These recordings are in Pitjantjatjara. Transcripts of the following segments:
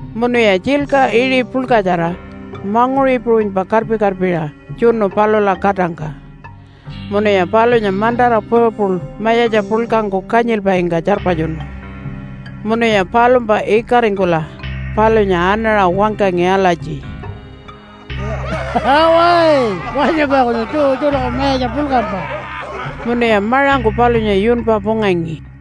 Munuya tjilka iṟi puḻkatjara manguṟi puṟunypa karpi-karpiṟa tjunu palula katangka. Munuya palunya mantara purple mayatja puḻkangku kanyilpaingka tjarpatjunu. Munuya palumpa ikaringkula palunya anaṟa wangkangi alatji, “Awa, Wanyumpa kunyun Jew tjuṯaku mayatja puḻkampa.” Munuya maṟangku palunya yunpa pungangi.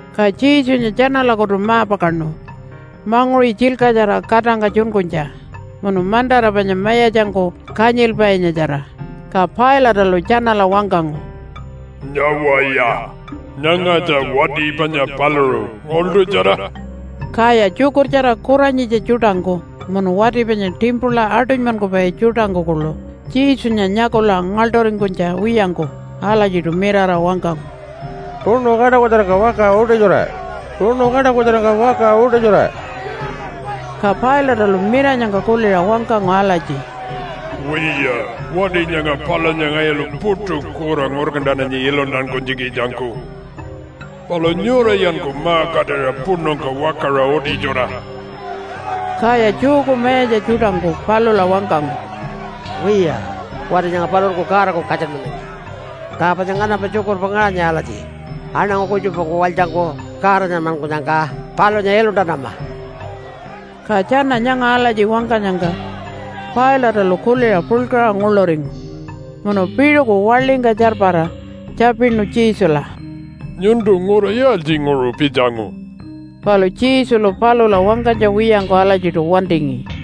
Ka Jesunya tjanalakutu ma-pakaṉu manguṟi tjilkatjara katangka tjunkunytja munu mantara panya mayatjangku kanyilpainyatjara. Ka Pilate-alu tjanala wangkangu, “Nyawaya! Nyangatja wati panya paluṟu, ngaḻṯutjara.” Kaya tjukurtjara kuranyitja tjuṯangku munu wati panya timpula aṯunymankupai tjuṯangku kuḻu Jesunya nyakula ngaḻṯuringkunytja wiyangku alatjiṯu mirara wangkangu, “Puṉu kaṯakutjarangka wakaṟa utitjura! Puṉu kaṯakutjarangka wakaṟa utitjura!” Ka Pilate-alu miranyangka kuliṟa wangkangu alatji, “Wiya, wati nyanga palunya ngayulu puṯu kura ngurkantananyi iluntankunytjikitjangku. Palu nyurayanku ma-katira puṉungka wakaṟa utitjura.” Kaya Jewku mayatja tjuṯangku palula wangkangu, “Wiya, wati nyanga paluṟunku Godaku katjanmanangi. Ka panya nganampa tjukurpa ngaṟanyi alatji, ‘Aṉangu kutjupangku walytjangku Godanyanmankunyangka palunya iluntanama.’” Ka tjana nyanga alatji wangkanyangka Pilate-alu kuliṟa puḻkaṟa nguḻuringu. Munu piṟuku waḻingka tjarpara tjapinu Jesula, “Nyuntu ngura yaaltjinguṟu pitjangu?” Palu Jesulu palula wangkanytja wiyangku alatjiṯu wantingi.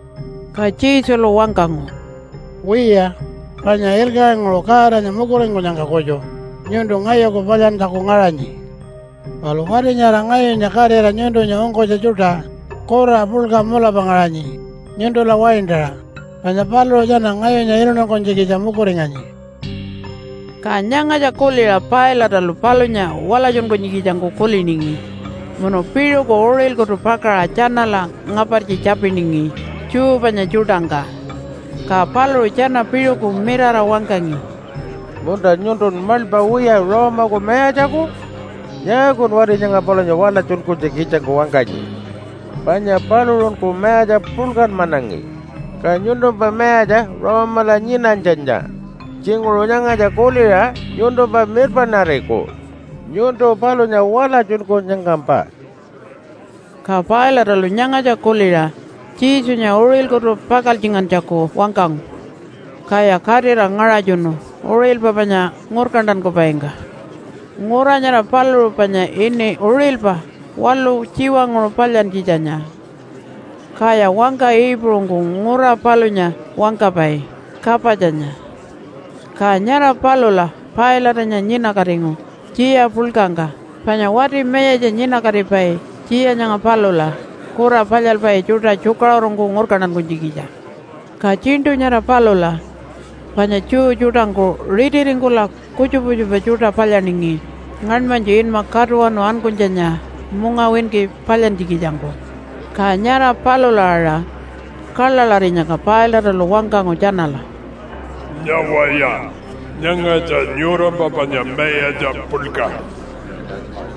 Ka Jesulu wangkangu, “Wiya, panya ilkaṟinguṟu Godanya mukuringkunyangka kutju nyuntu ngayuku palyantjaku ngaṟanyi. Palu wati nyara ngayunya katira nyuntunya ungkunytja tjuṯa kura puḻka mulapa ngaṟanyi nyuntula waintaṟa, panya paluṟu tjana ngayunya iluntankunytjikitja mukuringanyi.” Ka nyangatja kuliṟa Pilate-alu palunya walatjunkunytjikitjangku kuliningi munu piṟuku uṟilkutu pakaṟa tjanala ngapartji tjapiningi Jew panya tjuṯangka. Ka paluṟu tjana piṟuku mirara wangkangi, “Munta, nyuntun maḻpa wiya Rome-aku mayatjaku? Nyaakun wati nyanga palunya walatjunkunytjikitjangku wangkanyi? Panya paluṟunku mayatja puḻkanmanangi. Ka nyuntumpa mayatja Rome-ala nyinanytjanya tjinguṟu nyangatja kuliṟa nyuntumpa mirpaṉariku nyuntu palunya walatjunkunyangkampa.” Ka Pilate-alu nyangatja kuliṟa Jesunya uṟilkutu pakaltjingantjaku wangkangu. Kaya katira ngaṟatjunu uṟilpa panya ngurkantankupaingka. (Ngura nyara paluṟu panya ini Uṟilpa Waḻu Tjiwanguṟu Palyantjitjanya, kaya wangka Iipuṟungku ngura palunya wangkapai, Kapatjanya.) Ka nyara palula Pilate-anya nyinakatingu tjiya puḻkangka, panya wati mayatja nyinakatipai tjiya nyanga palula kura palyalpai tjuṯa tjukaṟurungku ngurkantankunytjikitja. Ka tjiṉṯu nyara palula panya Jew tjuṯangku ritiringkula kutjupa kutjupa tjuṯa palyaningi ngaṉmanytju inma Katuwanu Ankunytjanya mungawinki palyantjikitjangku. Ka nyara palula aṟa kaḻaḻarinyangka Pilate-alu wangkangu tjanala, “Nyawaya! Nyangatja nyurampa panya mayatja puḻka.”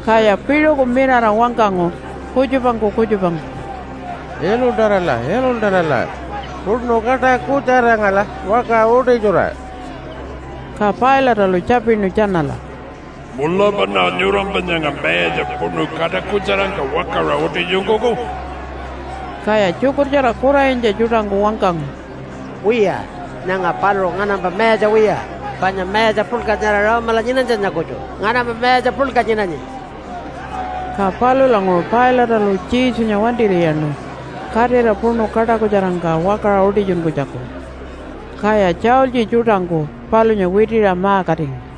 Kaya piṟuku mirara wangkangu kutjupangku kutjupangku, “Iluntarala! Iluntarala! Puṉu kaṯakutjarangkala wakaṟa utitjura.” Ka Pilate-alu tjapinu tjanala, “Mulapaṉa nyurampa nyanga mayatja puṉu kaṯakutjarangka wakaṟa utitjunkuku?” Kaya tjukurtjara kuranyitja tjuṯangku wangkangu, “Wiya, nyanga paluṟu nganampa mayatja wiya, panya mayatja puḻka nyara Rome-ala nyinanytjanya kutju nganampa mayatja puḻka nyinanyi.” Ka palulanguṟu Pilate-alu Jesunya wantir'iyaṉu katira puṉu kaṯakutjarangka wakaṟa utitjunkunytjaku. Kaya tjaultji tjuṯangku palunya witiṟa ma-katingu.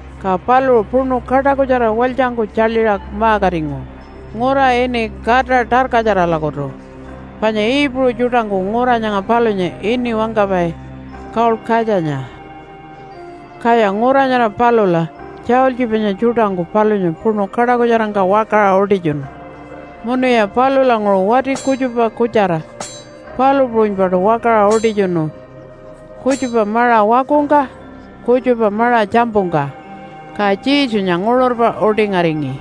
Ka paluṟu puṉu kaṯakutjara walytjangku tjaḻiṟa ma-katingu ngura ini Kata Tarkatjaralakutu. (Panya Iipuṟu tjuṯangku ngura nyanga palunya ini wangkapai, Kaulkatjanya.) Kaya ngura nyara palula tjaultji panya tjuṯangku palunya puṉu kaṯakutjarangka wakaṟa utitjunu. Munuya palulanguṟu wati kutjupa kutjara palu puṟunypaṯu wakaṟa utitjunu kutjupa maṟa wakungka, kutjupa maṟa tjampungka. Ka Jesunya nguṟurpa utingaringi.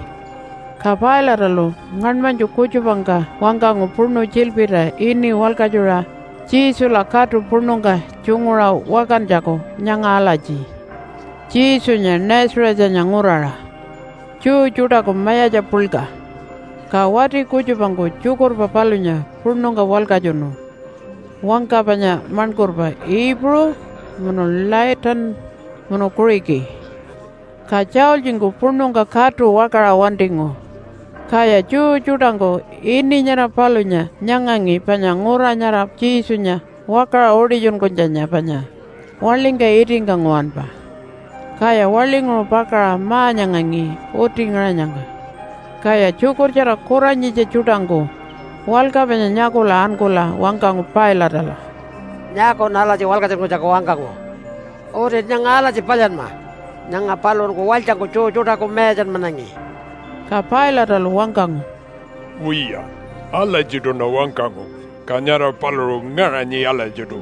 Ka Pilate-alu ngaṉmanytju kutjupangka wangkangu puṉu tjilpirta ini walkatjuṟa Jesula katu puṉungka tjunguṟa wakantjaku nyanga alatji, Jesunya Nazarethanya Nguraṟa Jew Tjuṯaku Mayatja Puḻka Ka wati kutjupangku tjukurpa palunya puṉungka walkatjunu wangka panya maṉkurpa Iipuṟu munu Latin munu Kuṟiki, ka tjaultjingku puṉungka katu wakaṟa wantingu. Kaya Jew tjuṯangku ini nyara palunya nyangangi, panya ngura nyara Jesunya wakaṟa utitjunkunytjanya panya waḻingka itingka nguwanpa, kaya waḻinguṟu pakaṟa ma-nyangangi uti ngaṟanyangka. Kaya tjukurtjara kuranyitja tjuṯangku walka panya nyakula ankula wangkangu Pilate-ala, “Nyaakun alatji walkatjunkunytjaku wangkangu. Utin nyanga alatji palyanma, ‘Nyanga paluṟunku walytjangku Jew tjuṯaku mayatjanmanangi.’” Ka Pilate-alu wangkangu, “Wiya, alatjiṯuṉa wangkangu. Ka nyara paluṟu ngaṟanyi alatjiṯu.”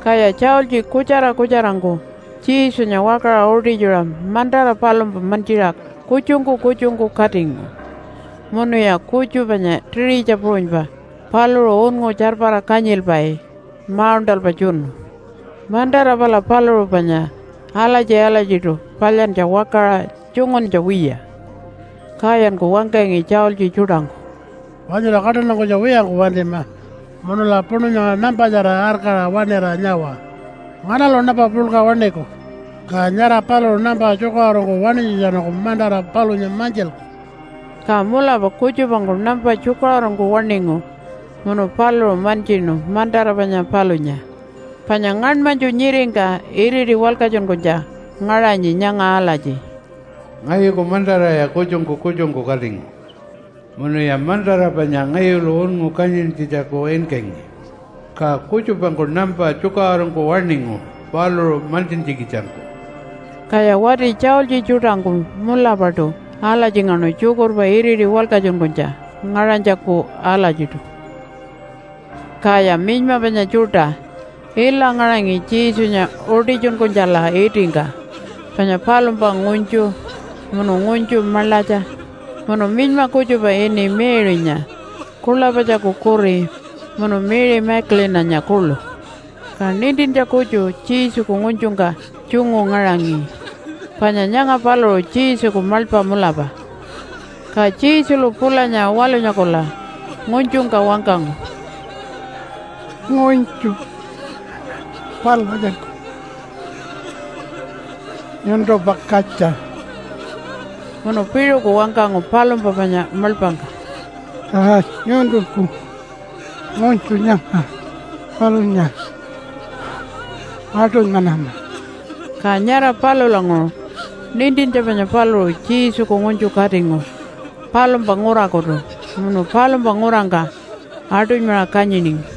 Kaya tjaultji kutjara kutjarangku Jesunya wakaṟa utitjuṟa mantara palumpa mantjiṟa kutjungku kutjungku katingu. Munuya kutju panya tiṟitja puṟunypa paluṟu unngu tjarpara kanyilpai mauṉṯalpa tjunu. Mantara pala paluṟu panya alatji-alatjiṯu palyantja wakaṟa tjunguntja wiya. Kayanku wangkangi tjaultji tjuṯangku, “Wanyula kaṯantankunytja wiyangku wantima munula puṉu nyanga nampatjara arkaṟa waṉira nyawa, ‘Nganalu nampa puḻka waṉiku?’ Ka nyara paluṟu nampa tjukaṟurungku waṉinytjatjanungku mantara palunya mantjilku.” Ka mulapa kutjupangku nampa tjukaṟurungku waṉingu munu paluṟu mantjinu mantara panya palunya. Panya ngaṉmanytju nyiringka iriti walkatjunkunytja ngaṟanyi nyanga alatji, “Ngayuku mantaraya kutjungku kutjungku katingu. Munuya mantara panya ngayulu unngu kanyintjitjaku inkangi, ka kutjupangku nampa tjukaṟurungku waṉingu paluṟu mantjintjikitjangku.” Kaya wati tjaultji tjuṯangku mulapaṯu alatjingaṉu tjukurpa iriti walkatjunkunytja ngaṟanytjaku alatjiṯu. Kaya minyma panya tjuṯa ila ngaṟangi Jesunya utitjunkunytjala itingka panya palumpa ngunytju, munu ngunytju maḻatja, munu minyma kutjupa ini Mary-nya Kulapatjaku kuri, munu Mary Magdalene-anya kuḻu. Ka nintintja kutju Jesuku ngunytjungka tjungu ngaṟangi, panya nyanga paluṟu Jesuku maḻpa mulapa. Ka Jesulu pulanya walunyakula ngunytjungka wangkangu, “Ngunytju, palatjanku nyuntumpa katja.” Munu piṟuku wangkangu palumpa panya maḻpangka, “Ka nyuntunku ngunytju nyanga palunya aṯunymanama.” Ka nyara palulanguṟu nintintja panya paluṟu Jesuku ngunytju katingu palumpa ngurakutu munu palumpa ngurangka aṯunymaṟa kanyiningi.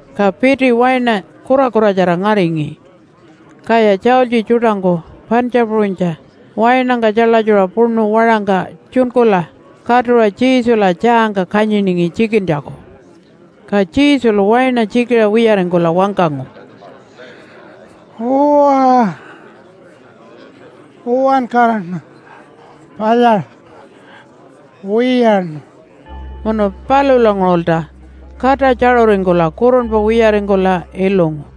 Ka piti waina kurakuratjara ngaṟangi, kaya tjaultji tjuṯangku pantja puṟunytja wainangka tjaḻatjuṟa puṉu waṟangka tjunkula katuṟa Jesula tjaangka kanyiningi tjikintjaku. Ka Jesulu waina tjikiṟa wiyaringkula wangkangu, “Uwa, uwankaraṉa palyaṟa wiyaṉu.” Munu palulanguṟulta kata tjaṟuringkula kurunpa wiyaringkula ilungu.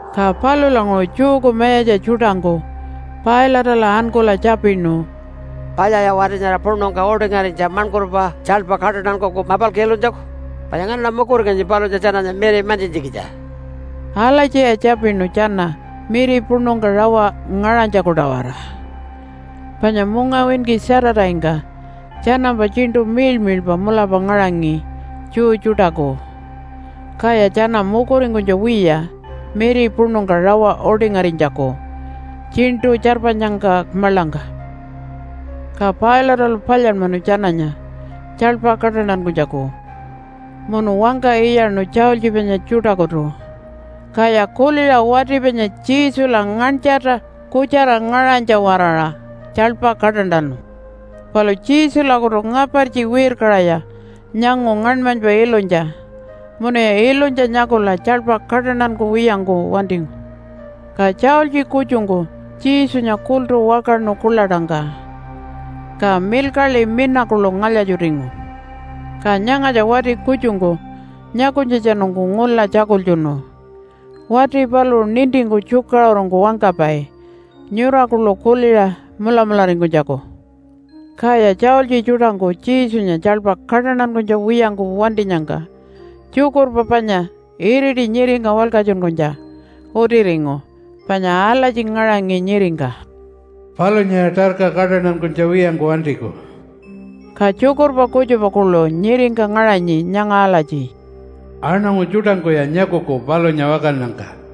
Ka palulanguṟu Jewku mayatja tjuṯangku Pilate-ala ankula tjapinu, “Palyaya wati nyara puṉungka utingarinytja maṉkurpa tjaḻpa kaṯantankuku mapalku ilunytjaku? Panya nganaṉa mukuringanyi palunya tjananya miri mantjintjikitja.” Alatjiya tjapinu tjana miri puṉungka rawa ngaṟanytjaku-tawara. Panya mungawinki Saturday-ngka tjanampa tjiṉṯu miḻmiḻpa mulapa ngaṟangi Jew tjuṯaku, kaya tjana mukuringkunytja wiya miri puṉungka rawa utingarinytjaku tjiṉṯu tjarpanyangka maḻangka. Ka Pilate-alu palyanmanu tjananya tjaḻpa kaṯantankunytjaku munu wangka iyaṉu tjaultji panya tjuṯakutu. Kaya kuliṟa wati panya Jesula nganytjarta kutjara ngaṟanytja-waraṟa tjaḻpa kaṯantanu. Palu Jesulakutu ngapartji wirkaṟaya nyangu ngaṉmanypa ilunytja munuya ilunytja nyakula tjaḻpa kaṯantankuwiyangku wantingu. Ka tjaultji kutjungku Jesunya kultu wakaṉu kuḻaṯangka, ka milkaḻi mina kuḻu ngalya-tjutingu. Ka nyangatja wati kutjungku nyakunytjatjanungku ngula tjakultjunu. Wati paluṟu nintingku tjukaṟurungku wangkapai nyura kuḻu kuliṟa mulamularingkunytjaku. Kaya tjaultji tjuṯangku Jesunya tjaḻpa kaṯantankunytja wiyangku wantinyangka tjukurpa panya iriti nyiringka walkatjunkunytja utiringu panya alatji ngaṟanyi nyiringka, “Palunyaya tarka kaṯantankunytja wiyangku wantiku.” Ka tjukurpa kutjupa kuḻu nyiringka ngaṟangi nyanga alatji, “Aṉangu tjuṯangkuya nyakuku palunya wakannyangka.”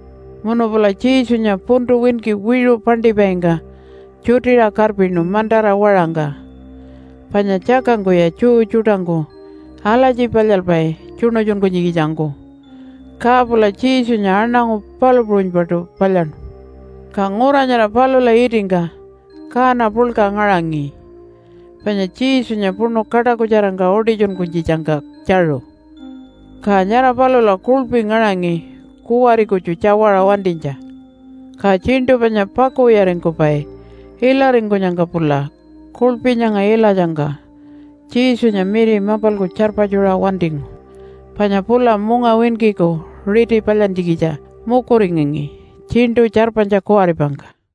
Munu pula Jesunya puntu winki wiṟu paṉṯipaingka tjutiṟa karpinu mantara waṟangka. Panya tjakangkuya Jew tjuṯangku alatji palyalpai tjuṉutjunkunytjikitjangku, ka pula Jesunya aṉangu palu puṟunypaṯu palyaṉu. Ka ngura nyara palula itingka kaana puḻka ngaṟangi, panya Jesunya puṉu kaṯakutjarangka utitjunkunytjitjangka tjaṟu. Ka nyara palula kuḻpi ngaṟangi kuwari kutju tjawaṟa wantinytja. Ka tjiṉṯu panya pakuwiyaringkupai ilaringkunyangka pula kuḻpi nyanga ilatjangka Jesunya miri mapalku tjarpatjuṟa wantingu, panya pula mungawinkiku riti palyantjikitja mukuringangi tjiṉṯu tjarpanytja kuwaripangka.